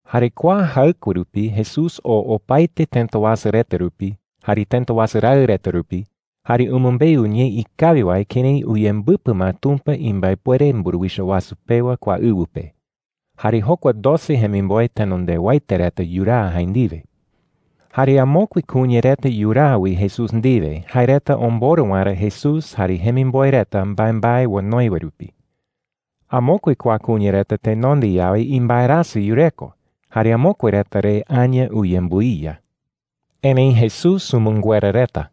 Jare kua jaɨkue rupi Jesús oo opaete tëta wasu reta rupi jare tëta wasu raɨ reta rupi, jare umɨmbeu ñee ikawi wae kërái uyembɨpɨ ma Tumpa imbaepuere mburuwicha wasu pewa kua ɨwɨ pe. Jare jokua doce jemimboe tenondewaete reta yuraa jae ndiwe. Jare amokue kuña reta yuraa wi Jesús ndiwe jae reta omborɨ waerä Jesús jare jemimboe reta mbaembae onoi wae rupi. Amokue kua kuña reta tenonde yawe imbaerasɨ yureko, jare amokue reta re aña uyembɨiya. Erëi Jesús umɨnguera reta.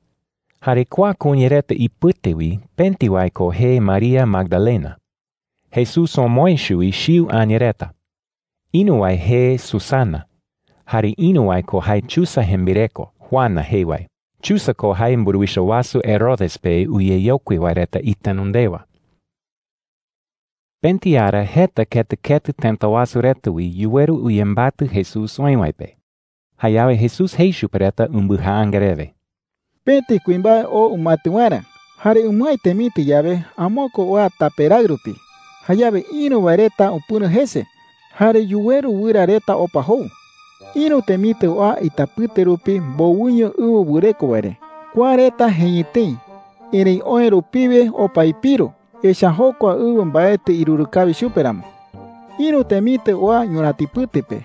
Jare kua kuña reta ipɨte wi pëti wae ko jee María Magdalena. Jesús omoë chuwi chiu aña reta. Ïru wae jee Susana. Jare ïru wae ko jae Chuza jembireko Juana jee wae. Chuza ko jae mburuwicha wasu Herodes pe uyeyokui wae reta itenondewa. Pëti ara jeta ketɨ ketɨ tëta wasu reta wi yuweru uyembatɨ Jesús oï wae pe. Jayawe Jesús jei chupe reta umbɨjaanga rewe: “Pëti kuimbae oo umaetɨ waerä. Jare umɨái temitɨ yawe, amokue oa tape raɨ rupi. Jayawe ïru wae reta upɨ̈ro jese, jare yuweru wɨra reta opa jou,” jei chupe reta. “Ïru temitɨ oa itapɨte rupi mbowɨño ɨwɨ wɨreko wae re. Kua reta jeñɨ tëi, erëi oë rupiwe opa ipiru, echa’ä jokua ɨwɨ mbaetɨ iruru kawi chupe ramo,” jei. “Ïru temitɨ oa ñurätipɨte pe.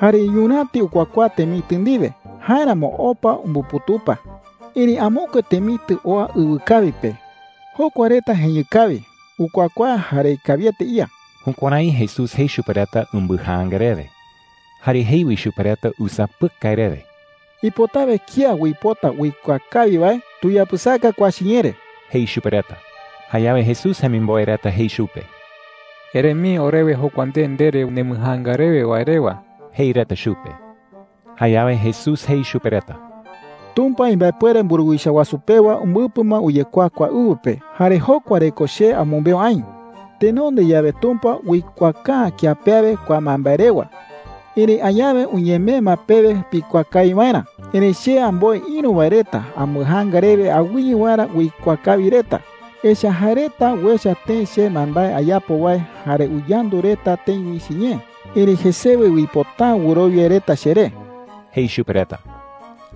Jare ñuräti ukuakuaa temitɨ ndiwe; jáeramo opa umbuputupa,” jei. “Erëi amokue temitɨ oa ɨwɨkawi pe. Jokua reta jeñɨ kawi, ukuakuaa, jare ikawiete ía.” Jukuärái Jesús jei chupe reta umbɨjaanga rewe. Jare jei wi chupe reta usapɨkai rewe: “Ipotawe kía uipota uikuaa kawi wae, tuyapɨsaka kua chiñee re,” jei chupe reta. Jayawe Jesús jemimboe reta jei chupe: “Ere mii orewe jokua nde ndere nembɨjaanga rewe wae rewa,” jei reta chupe. Jayawe Jesús jei chupe reta: “Tumpa imbaepuere mburuwicha wasu pewa umbɨpɨ ma uyekuaa kua ɨwɨ pe. Jare jokua re ko che amɨmbeu aï,” jei. “Tenonde yawe Tumpa uikuaaka’ä kía pe awe kua mbaembae rewa. Erëi añawe uñemee ma pewe pikuaa kawi waerä. Erëi che amboe ïru wae reta ambɨjaanga rewe awɨye waerä uikuaa kawi reta. Echa’ä jae reta uecha tëi che mbaembae ayapo wae jare uyandu reta tëi wi chiñee, erëi jesewe uipota’ä wɨrowia reta cheré,” jei chupe reta.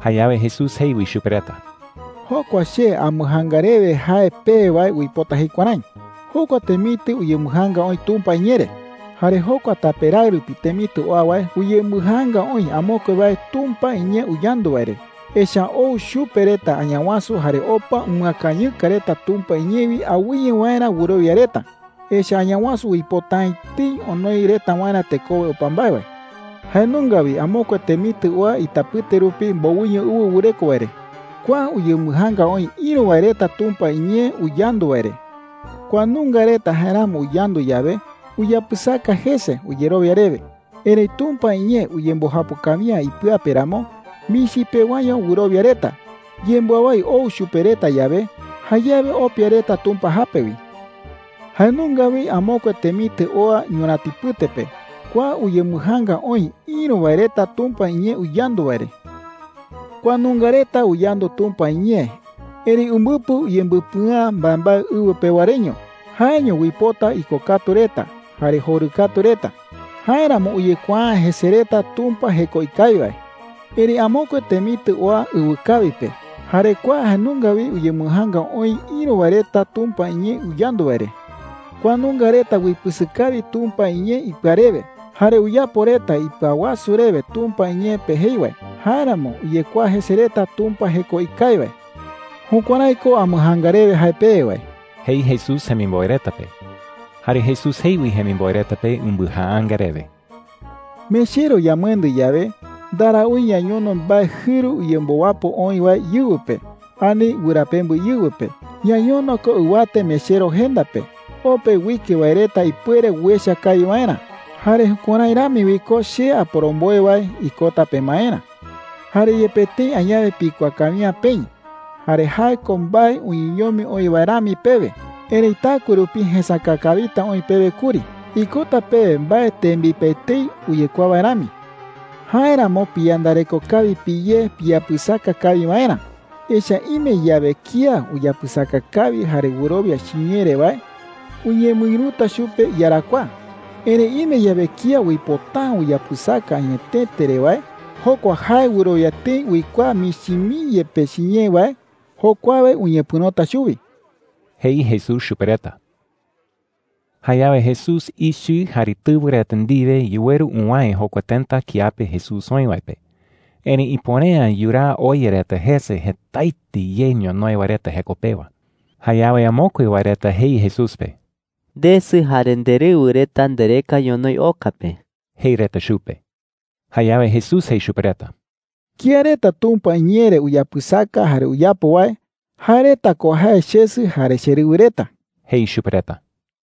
Jayawe Jesús jei wi chupe reta: “Jokua che ambɨjaanga rewe jae pewe wae uipota jei kuärái: Jokua temitɨ uyembɨjaanga oï Tumpa iñee re,” jei. “Jare jokua tape raɨ rupi temitɨ oa wae uyembɨjaanga oï amokue wae Tumpa iñee uyandu wae re. Echa’ä ou chupe reta Añawasu jare opa umɨakañɨka reta Tumpa iñee wi awɨye waerä wɨrowia reta. Echa’ä Añawasu uipota’ä etei onoi reta waerä tekowe opa mbae wae,” jei chupe reta. “Jae nunga wi amokue temitɨ oa itapɨte rupi mbowɨño ɨwɨ wɨreko wae re,” jei. “Kua uyembɨjaanga oï ïru wae reta Tumpa iñee uyandu wae re. Kua nunga reta jaeramo uyandu yawe, uyapɨsaka jese uyerowia rewe,” jei. “Erëi Tumpa iñee uyembɨjapo kawi’ä ipɨa pe ramo, michi pewaño wɨrowia reta. Yembɨawái ou chupe reta yawe, jayawe opia reta Tumpa jape wi,” jei chupe reta. “Jae nunga wi amokue temitɨ oa ñurätipɨte pe. Kua uyembɨjaanga oï ïru wae reta Tumpa iñee uyandu wae re,” jei. “Kua nunga reta uyandu Tumpa iñee, erëi umbɨpɨ uyembɨpɨa’ä mbaembae ɨwɨ pewa reño. Jaeño uipota ikokatu reta jare jorɨkatu reta. Jáeramo uyekuaa’ä jese reta Tumpa jeko ikawi wae,” jei chupe reta. “Erëi amokue temitɨ oa ɨwɨkawi pe. Jare kua jae nunga wi uyembɨjaanga oï ïru wae reta Tumpa iñee uyandu wae re,” jei. “Kua nunga reta uipɨsɨ kawi Tumpa iñee ipɨa rewe. Jare uyapo reta ipɨawasu rewe Tumpa iñee pe jei wae. Jáeramo uyekuaa jese reta Tumpa jeko ikawi wae,” jei chupe reta. “Jukuärái ko ambɨjaanga rewe jae pewe wae,” jei Jesús jemimboe reta pe. Jare Jesús jei wi jemimboe reta pe umbɨjaanga rewe: “Mechero yamɨendɨ yawe, ndaraúi ñañono mbae jɨru uyembowapo oï wae íɨwɨ pe ani wɨrapembɨ íɨwɨ pe. Ñañono ko ɨwate mechero jenda pe, o pe uike wae reta ipuere uecha kawi waerä. Jare jukuärái rami wi ko che aporomboe wae ikota pemaerä,” jei. “Jare yepe tëi añawe pikuaa kawi’ä peï jare jae ko mbae uñeñomi oï wae rami pewe, erëi taɨkue rupi jesäka kawita oï pewe kuri. Ikota pewe mbae tembipe etei uyekuaa wae rami,” jei chupe reta. “Jáeramo piyandareko kawi piyé piyapɨsaka kawi waerä. Echa’ä ime yawe kía uyapɨsaka kawi jare wɨrowia chiñee re wae, uñemɨïruta chupe iyarakuaa,” jei. “Erëi ime yawe kía uipota’ä uyapɨsaka añetete re wae, jokua jae wɨrowia tëi uikuaa michi mii yepe chiñee wae, jokuawe uñepɨ̈rota chuwi,” jei Jesús chupe reta. Jayawe Jesús ichɨ jare tɨwɨ reta ndiwe yuweru uwäe jokua tëta kiape Jesús oï wae pe. Erëi ipuere’ä yuraa oya reta jese jetaete ye ñonoï wae reta jeko pewa. Jayawe amokue wae reta jei Jesús pe: “Ndesɨ jare nderɨwɨ reta ndereka ñonoï oka pe,” jei reta chupe. Jayawe Jesús jei chupe reta: “Kía reta Tumpa iñee re uyapɨsaka jare uyapo wae, jae reta ko jae chesɨ jare cherɨwɨ reta,” jei chupe reta.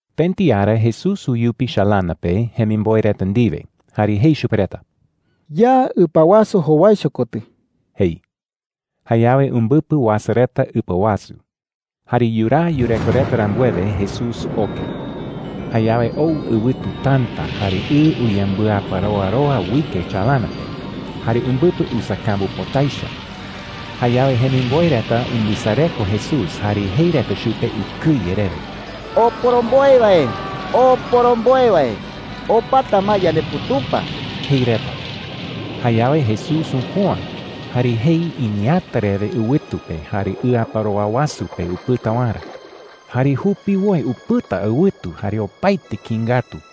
Pëti ara Jesús uyupi chalana pe jemimboe reta ndiwe jare jei chupe reta: “Ya ɨpa wasu jowaicho kotɨ,” jei. Jayawe umbɨpɨ uasa reta ɨpa wasu. Jare yuraa yureko reta rambuewe, Jesús oke. Jayawe ou ɨwɨtu täta, jare ɨ uyembɨaparoaroa uike chalana pe, jare umbɨpɨ usakambu pota echa. Jayawe jemimboe reta umbɨsareko Jesús jare jei reta chupe ukɨye rewe: “¡Oporomboe wae, oporomboe wae, opata ma yandeputupa!” jei reta. Jayawe Jesús upüa, jare jei iñeeäta rewe ɨwɨtu pe jare ɨaparoa wasu pe upɨta waerä. Jare jupiwoi upɨta ɨwɨtu jare opaete kïi ngatu.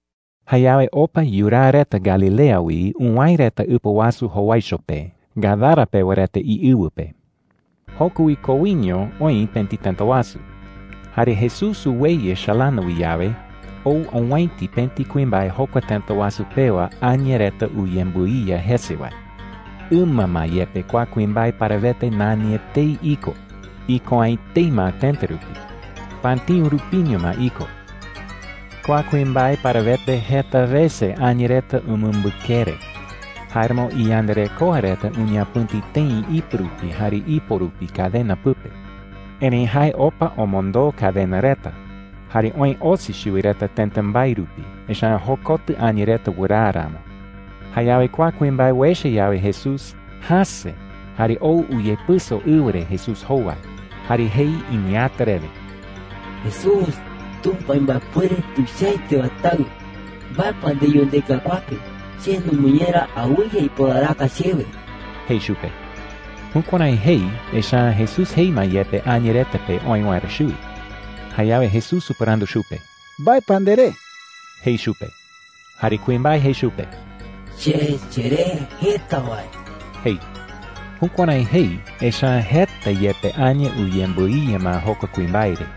Jayawe opa yuraa reta Galilea wi uwäe reta ɨpa wasu jowaicho pe, Gadara pewa reta iɨwɨ pe. Joko wi koiño oï pëti tëta wasu. Jare Jesús uweyɨ chalana wi yawe, ou owäiti pëti kuimbae jokua tëta wasu pewa aña reta uyembɨiya jese wae. Ɨma ma yepe kua kuimbae parawete nani etei iko. Iko’ä etei ma tëta rupi. Patïu rupiño ma iko. Kua kuimbae parawete, jeta wese aña reta umɨmbɨkere. Jáeramo iyandarekoa reta uñapɨ̈ti tëi ipɨ rupi jare ipo rupi cadena pɨpe. Erëi jae opa omondoo cadena reta jare oë osi chuwi reta tëta mbae rupi, echa’ä jokotɨ aña reta wɨraa ramo. Jayawe kua kuimbae uecha yawe Jesús, jäse jare ou uyepɨso ɨwɨ re Jesús jowai. Jare jei iñeeäta rewe: “Jesús, Tumpa imbaepuere tuichaete wae Taɨ, ¿mbae pa ndeyu ndeka kua pe? Che numɨñera, awɨye iporaraka chewe,” jei chupe. Jukuärái jei, echa’ä Jesús jei ma yepe aña reta pe oë waerä chuwi. Jayawe Jesús upɨrandu chupe: “¿Mbae pa nderee?” jei chupe. Jare kuimbae jei chupe: “Che cheree Jeta Wae,” jei. Jukuärái jei, echa’ä jeta yepe aña uyembɨiya ma jokua kuimbae re.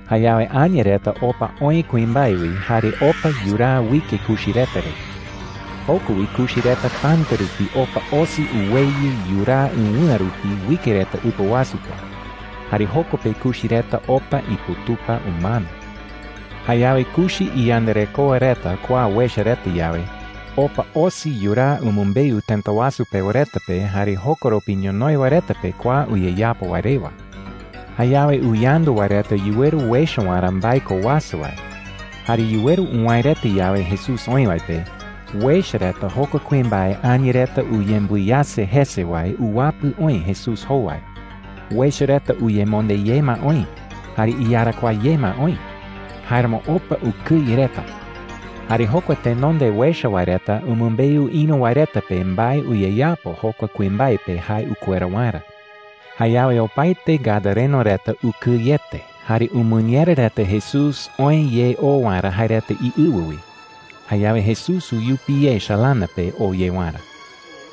Jayawe aña reta opa oë kuimbae wi jare opa yuraa uike kuchi reta re. Joko wi kuchi reta täta rupi opa osi uweyɨ yuraa ɨwɨ̈a rupi uike reta ɨpa wasu pe. Jare joko pe kuchi reta opa iputupa umano. Jayawe kuchi iyandarekoa reta kua uecha reta yawe, opa osi yuraa umɨmbeu tëta wasu pewa reta pe jare jokoropi ñonoï wae reta pe kua uyeyapo wae rewa. Jayawe uyandu wae reta yuweru uecha waerä mbae ko uasa wae. Jare yuweru uwäe reta yawe Jesús oï wae pe, uecha reta jokua kuimbae aña reta uyembɨiyase jese wae uwapɨ oï Jesús jowai. Uecha reta uyemonde ye ma oï jare iyarakuaa ye ma oï. Jáeramo opa ukɨye reta. Jare jokua tenonde uecha wae reta umɨmbeu ïru wae reta pe mbae uyeyapo jokua kuimbae pe jae ukuera waerä. Jayawe opaete gadareno reta ukɨyete jare umɨñera reta Jesús oë ye oo waerä jae reta iɨwɨ wi. Jayawe Jesús uyupi ye chalana pe oo ye waerä.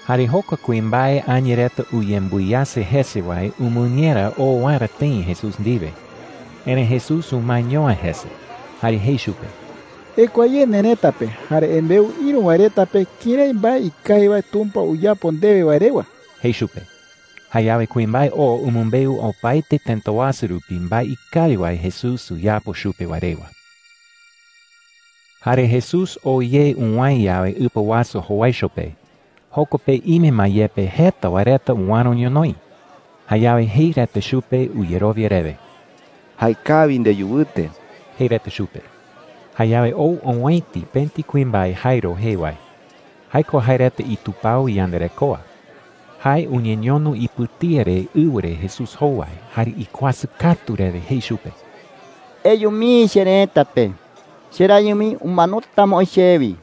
Jare jokua kuimbae aña reta uyembɨiyase jese wae umɨñera oo waerä tëi Jesús ndiwe. Erëi Jesús umaeño’ä jese jare jei chupe: “Ekua ye nerëta pe jare embeu ïru wae reta pe kërái mbae ikawi wae Tumpa uyapo ndewe wae rewa,” jei chupe. Jayawe kuimbae oo umɨmbeu opaete tëta wasu rupi mbae ikawi wae Jesús uyapo chupe wae rewa. Jare Jesús oo ye uwäe yawe ɨpa wasu jowaicho pe, joko pe ime ma yepe jeta wae reta uäro ñonoï. Jayawe jei reta chupe uyerowia rewe: “Jaekawi ndeyu wɨte,” jei reta chupe. Jayawe ou owäiti pëti kuimbae Jairo jee wae. Jae ko jae reta itupao iyandarekoa. Jae uñeñono ipɨtía re ɨwɨ re Jesús jowai jare ikuasɨ katu rewe jei chupe: “Eyu mii cherëta pe. Cherayɨ mii umanota ma oï chewi.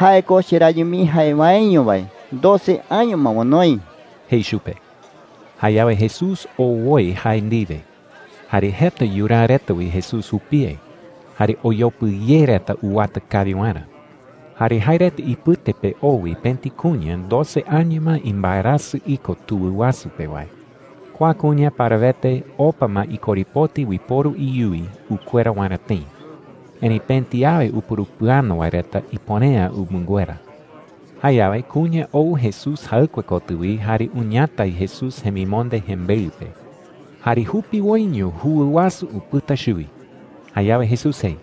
Jae ko cherayɨ mii jae waeño wae doce año ma onoi,” jei chupe. Jayawe Jesús oo woi jae ndiwe. Jare jeta yuraa reta wi Jesús jupie, jare oyopɨ ye reta uwata kawi waerä. Jare jae reta ipɨte pe oo wi pëti kuña doce año ma imbaerasɨ iko tuwɨ wasu pe wae. Kua kuña parawete opa ma ikorepoti uiporu iyuwi ukuera waerä tëi. Erëi pëti awe upurupɨano wae reta ipuere’ä umɨnguera. Jayawe kuña ou Jesús jaɨkue kotɨ wi jare uñatai Jesús jemimonde jembeɨ pe. ¡Jare jupiwoiño juwɨ wasu upɨta chuwi! Jayawe Jesús jei: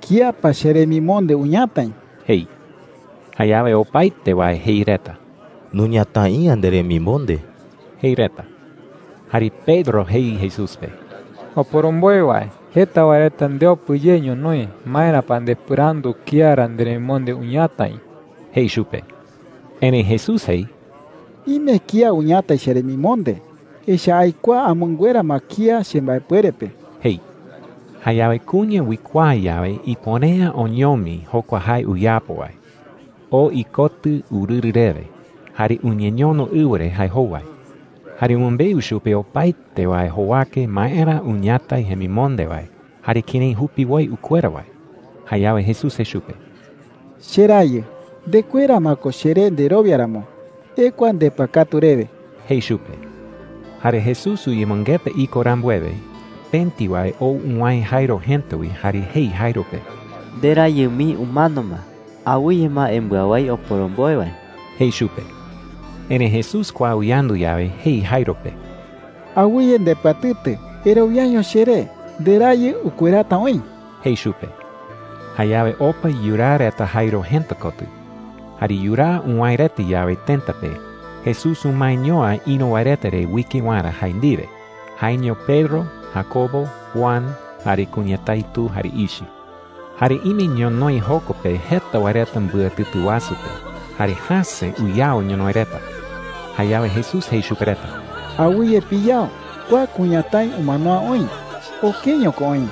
“¿Kía pa cheremimonde uñatai?” jei. Jayawe opaete wae jei reta: “Nuñatai’ä nderemimonde,” jei reta. Jare Pedro jei Jesús pe: “Oporomboe wae, jeta wae reta ndeopɨ ye ñonoï. ¿Maera pa ndepɨrandu kía ra nderemimonde uñatai?” jei chupe. Erëi Jesús jei: “Ime kía uñatai cheremimonde. Echa’ä aikuaa amɨnguera ma kía chembaepuere pe,” jei. Jayawe kuña uikuaa yawe ipuere’ä oñomi jokua jae uyapo wae, oo ikotɨ urɨrɨ rewe jare uñeñono ɨwɨ re jae jowai. Jare umɨmbeu chupe opaete wae jowake maera uñatai jemimonde wae jare kërái jupiwoi ukuera wae. Jayawe Jesús jei chupe: “Cherayɨ, ndekuera ma ko cheré nderowia ramo. Ekua ndepɨakatu rewe,” jei chupe. Jare Jesús uyemɨngeta iko rambuewe, pëti wae ou uwäe Jairo jëta wi jare jei Jairo pe: “Nderayɨ mii umano ma. Awɨye ma embɨawái oporomboe wae,” jei chupe. Erëi Jesús kua uyandu yawe, jei Jairo pe: “Awɨye ndepɨatɨtɨ. Erowiaño cheré. Nderayɨ ukuerata oï,” jei chupe. Jayawe opa yuraa reta Jairo jëta kotɨ. Jare yuraa uwäe reta yawe tëta pe, Jesús umaeño’ä ïru wae reta re uike waerä jae ndiwe – jaeño Pedro, Jacobo, Juan, jare kuñatái tu jare ichɨ. Jare ime ñonoï joko pe jeta wae reta mbɨatɨtɨ wasu pe, jare jäse uyao ñonoï reta. Jayawe Jesús jei chupe reta: “Awɨye piyao. Kua kuñatái umano’ä oï. Okeño ko oï,”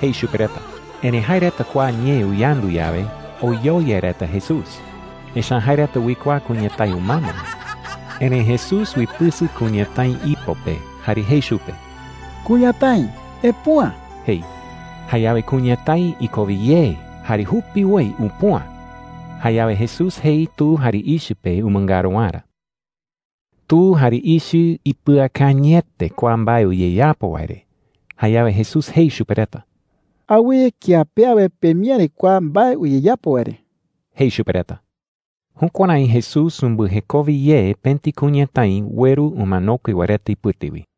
jei chupe reta. Erëi jae reta kua ñee uyandu yawe, oyoyai reta Jesús. Echa’ä jae reta uikuaa kuñatái umano ma. Erëi Jesús uipɨsɨ kuñatái ipo pe jare jei chupe: “¡Kuñatái, epüa!” jei. Jayawe kuñatái ikowe ye jare jupiwoi upüa. Jayawe Jesús jei tu jare ichɨ pe umɨngaru waerä. Tu jare ichɨ ipɨakañɨete kua mbae uyeyapo wae re. Jayawe Jesús jei chupe reta: “Awɨye kía pe awe pemiäri kua mbae uyeyapo wae re,” jei chupe reta. Jukuärái Jesús umbɨjekowe ye pëti kuñatái ueru umanokue wae reta ipɨte wi.